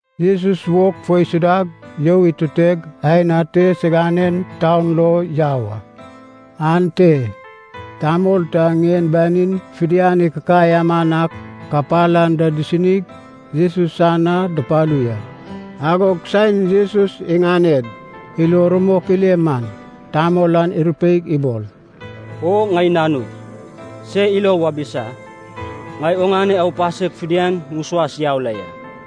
Jesus wog fo isudag you ituteg aen ate siganen taun lo yau a. Ante tamol ta ŋien banin fidian ikikai aman ak kapal anda disinig Jesus san na dupalu ya. Agog saen Jesus iŋaned ilo rumok ile man, tamol an irupeig ibol, “O ŋai nanug, se ilo wabisa; ŋai oŋane aupasek fidian ŋusuas yau la ya.”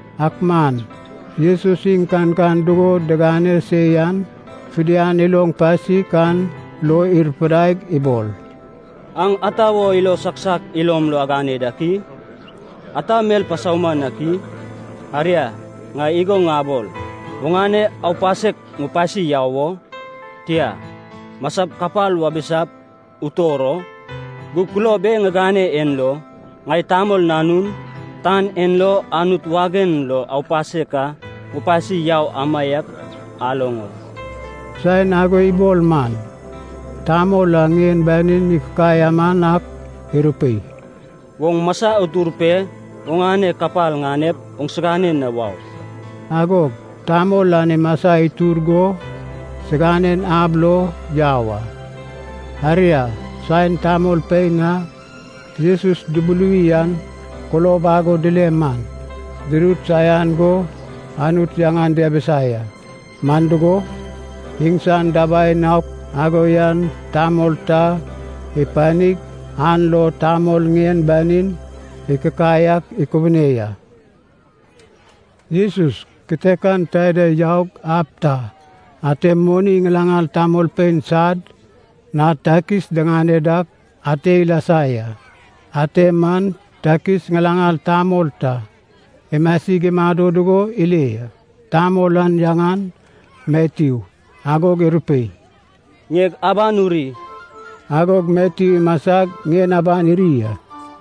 Ak man Jesus iŋ kankan dugo digane se yan fidian iloŋ pasik an lo irupidaig ibol, “Aŋ ata wo ilo saiak saiak ilom lo agane dak i? Ata mel pasauman ak i? Aria, ŋai igo ŋabol, ‘Oŋane aupasek ŋupasi yau wo?’ Tia, ‘Masap kapal wabisap utor o?’ Gug kulob e ŋigane en lo, ŋai Tamol Nanun, tan en lo Anut wagen lo aupasek ka ŋupasi yau amaiak aloŋ o...” saen ago ibol man, tamol a ŋien banin ikikai aman ak irupei, “Oŋ masa utur pe oŋane kapal ŋanep oŋsigane na wau.” Agog tamol an imasa itur go siganen ab lo yau a. Aria, saen tamolpein a Jesus dubuluwi an kulob ago dile man, dirut saian go Anut yaŋan diabisa ya, man dugo, iŋsan dabai naok ago yan tamol ta ipanig, an lo tamol ŋien banin ikikai ak ikubune ya. Jesus kitekan taida yaug ab ta, ate moni ŋilaŋal tamolpein sad na takis diŋane dak ate ilasa ya. Ate man takis ŋilaŋal tamol ta imasig imado dugo ile ya. Tamol an yaŋan Matyu. Agog irupei, “Ŋieg aban uri.” Agog Matyu imasag ŋien aban iri a.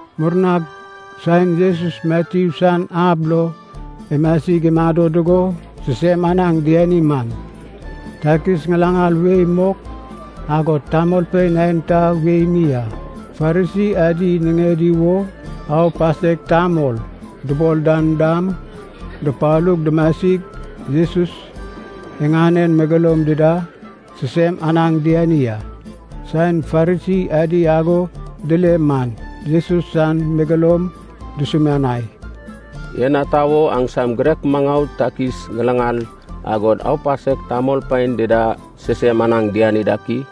Murnag saen Jesus Matyu san ab lo imasig imado dugo sisem anaŋ diani man, takis ŋilaŋal wei mok, agod tamolpein aenta wei mi a Farisi adi niŋedi wo “aupasek tamol” dubol dan dam, dupalug dumasig Jesus iŋanen megeloum dida sisem anaŋ diani a. Saen Farisi adi ago dile man Jesus san megeloum dusumianai, “En ata wo aŋsam girek maŋau takis ŋilaŋal, agod aupasek tamolpein dida sisem anaŋ diani dak i?”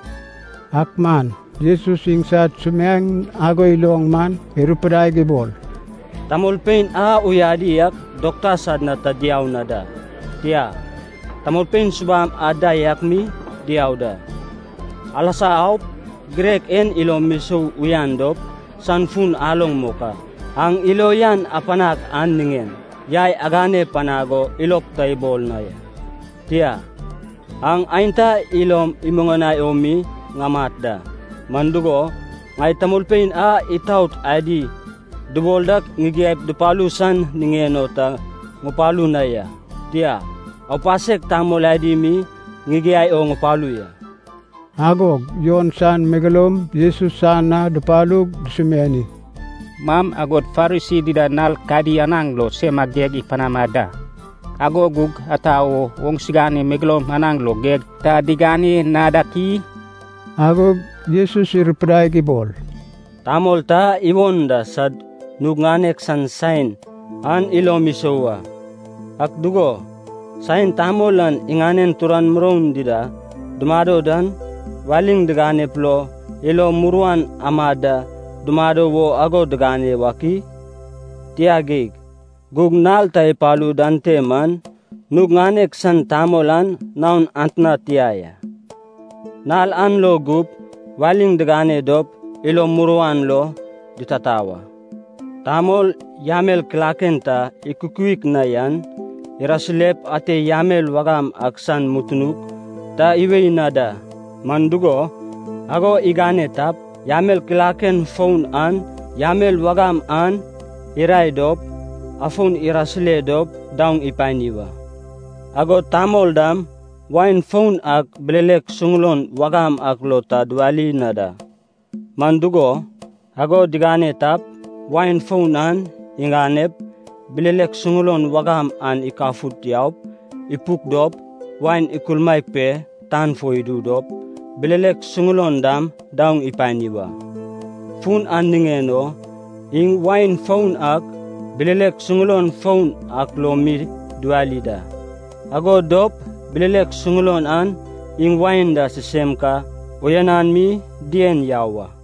Ak man Jesus iŋsad sumiaeŋ ago iloŋ man irupidaig ibol, “Tamolpein a uyadi ak dokta san na ta diau na da, tia, tamolpein subam anda yak mi diau da. Alasa aup girek en ilom isou uyan dop san fun aloŋ mok a, ‘Aŋ ilo uyan apanag an niŋen yai agane panag o ilog ta ibol na ya, tia, aŋ aenta ilom imuŋanai o mi ŋamat da.’ Man dugo, ŋai tamolpein a itaot adi dubol dak ŋigiaip dupalu san niŋen o ta ŋupalu na ya, tia, aupasek tamol adi mi ŋigiai o ŋupalu ya.” Agog Jon san megeloum Jesus san na dupalug dusumiani, “Maŋ agod Farisi dida nal kadi anaŋ lo sema geg ipanama da, ago gug ata wo oŋsigane megeloum anaŋ lo geg ta digane na dak i?” Agog Jesus irupidaig ibol, “Tamol ta iwon da sad nug ŋanek san saen an ilom isou a. Ak dugo, saen tamol an iŋanen turan muroun dida dumado dan, waliŋ diganep lo ilo muruan amad da dumado wo ago digane wak i? Tia geig. Gug nal ta ipalu dan te man, nug ŋanek san tamol an naon atna tia wa, nal an lo gup waliŋ digane dop ilo muruan lo ditata wa. “Tamol, yamel kilaken ta ikukuik na yan irasirep ate yamel wagam ak san mutunuk ta iwei na da. Man dugo, ago igane tap, yamel kilaken foun an yamel wagam an irae dop afon irasire dop daoŋ ipani wa. Agod tamol dam wain foun ak bilelek suŋulon wagam ak lo ta diwali na da. Man dugo, ago digane tap, wain foun an iganep bilelek suŋulon wagam an ikafut yaup ipuk dop, wain ikulmaek pe tan fo idu dop, bilelek suŋulon dam daoŋ ipani wa. Fun an niŋen o iŋ wain foun ak bilelek suŋulon foun ak lo mi diwali da, ago dop bilelek suŋulon an iŋ wain da sisem ka uyanan mi dien yau a.”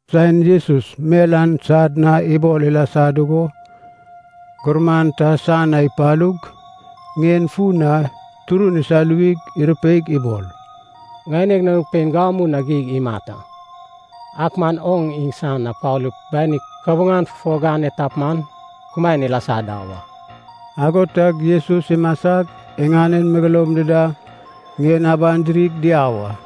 Saen Jesus mel an sad na ibol ilasa dugo, gurman ta san na ipalug ŋien fun na turun isaluwig irupeig ibol, “Ŋaineg nanug pein gamu na geig imat a, ak man oŋ iŋsan na palup bani kabuŋan fufo gane tap man, kumaen ilasa da wa.” Ago tag Jesus imasag iŋanen megeloum dida ŋien aban dirig diau a.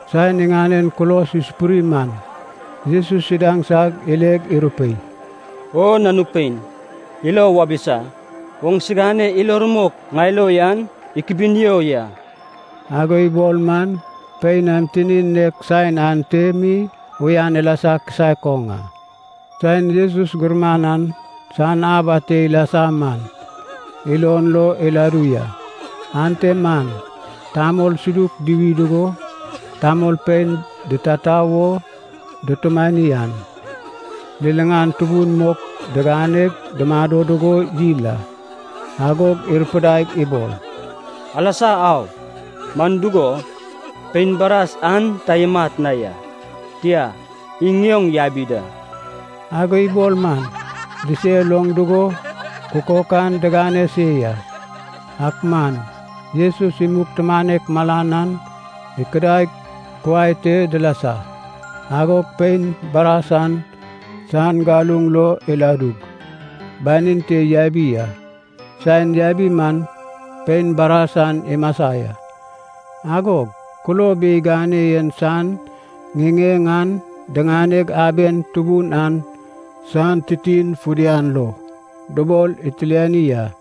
Saen iŋanen kulos isupuri man, Jesus idaŋsag ileg irupei, “O nanug pein, ilo wabisa, oŋsigane ilo rumok ŋai lo yan ikubunio ya.” Ago ibol man pein an tinin nek saen ante mi uyan ilasa kisaek oŋ a. Saen Jesus gurman an san ab ate ilasa man, ilon lo iladu ya. Ante man tamol suduk duwi dugo, tamolpein ditata wo dutumani an, liliŋan tubun mok diganeg dumado dugo yil a. Agog irupidaig ibol, “Alasa au, man dugo, pein baras an ta imat na ya. Tia, iŋ ŋioŋ yabi da.” Ago ibol man disel oŋ dugo kukok an digane se ya. Ak man Jesus imug tumanek malan an ikudaig kuai te dilasa, agog pein baras an san galuŋ lo iladug banin te yabi a. Saen yabi man pein baras an imasa ya. Agog kulob e igane yen san ŋiŋeŋ an diŋaneg aben tubun an san titin fidian lo dubol itiliani a.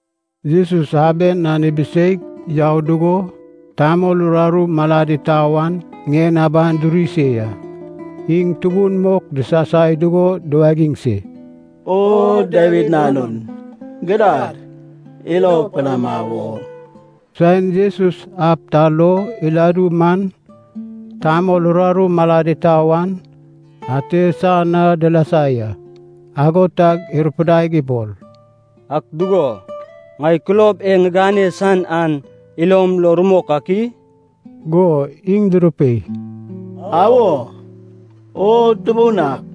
Jesus aben an ibiseig yau dugo tamol uraru malad itau an ŋien aban duri se ya. Iŋ tubun mok disasai dugo duwagiŋ se, “O Dawid Nanun, gidad ilo panama wo!” Saen Jesus ab ta lo iladu man, tamol uraru malad itau an ate san na dilasa ya. Ago tag irupidaig ibol, “Ak dugo, ŋai kulob e ŋigane san an ilom lo rumok ak i?” Go iŋ durupei, “Awo, O Tubun ak.”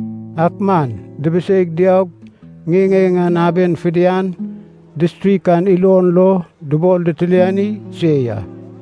Ak man dibiseig diaug ŋiŋeŋ an aben fidian distrik an ilon lo dubol ditiliani se ya.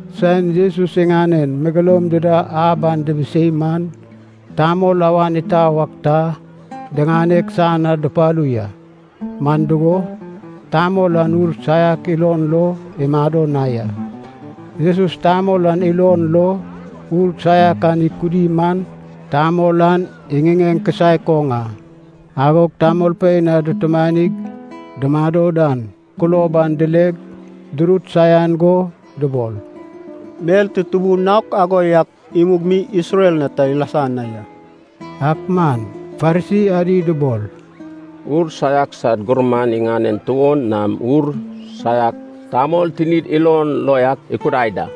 Saen Jesus iŋanen megeloum dida ab an dibisei man, tamol awan itau ak ta diŋaneg san na dupalu ya, man dugo, tamol an ur saiak ilon lo imado na ya. Jesus tamol an ilon lo ur saiak an ikudi man, tamol an iŋiŋeŋ kisaek oŋ a. Agog tamolpein a dutumanig dumado dan kulob an dileg durut saian go dubol, “Mel tutubu naok ago yak imug mi Isrel na ta ilasa na ya.” Ak man Farisi adi dubol, “Ur saiak sad gurman iŋanen tuon nam ur saiak tamol tinid ilon lo yak ikudai da.”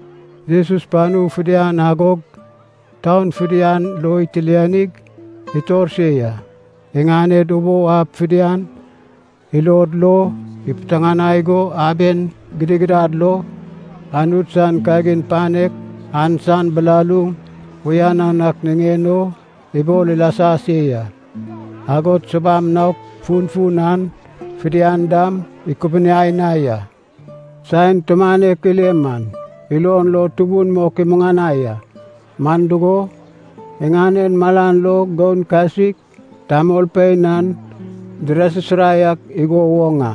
Jesus panu fidian agog taun fidian lo itilianig itor se ya. Iŋaned ubou ab fidian ilod lo ipiteŋanai go aben gidigidad lo Anut san kagin panek an san bilaluŋ uyanan ak niŋen o ibol ilasa se ya. Agod subam naok funfun an fidian dam ikubuniai na ya. Saen tumanek ile man, ilon lo tubun mok imuŋanai a, man dugo, iŋanen malan lo goun kasik tamolpein an dirasisirai ak igo woŋ a,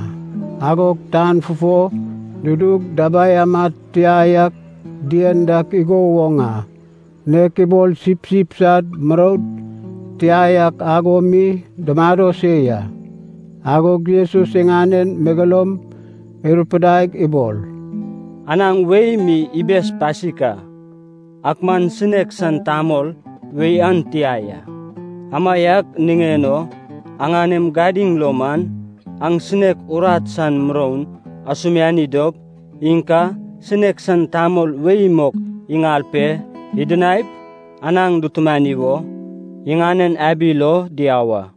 agod tan fufo dudug dabai amad tia yak dien dak igo woŋ a. Nek ibol sipsip sad muroun tia yak ago mi dumado se ya. Agog Jesus iŋanen megeloum irupidaig ibol, “Anaŋ wei mi ibes pasik a, ak man sinek san tamol wei an tia ya. Amaiak niŋen o aŋanem gadiŋ lo man, aŋ sinek urat san muroun asumiani dop iŋ ka sinek san tamol wei mok iŋal pe idinaip, anaŋ dutumani wo, iŋanen abi lo diau a.”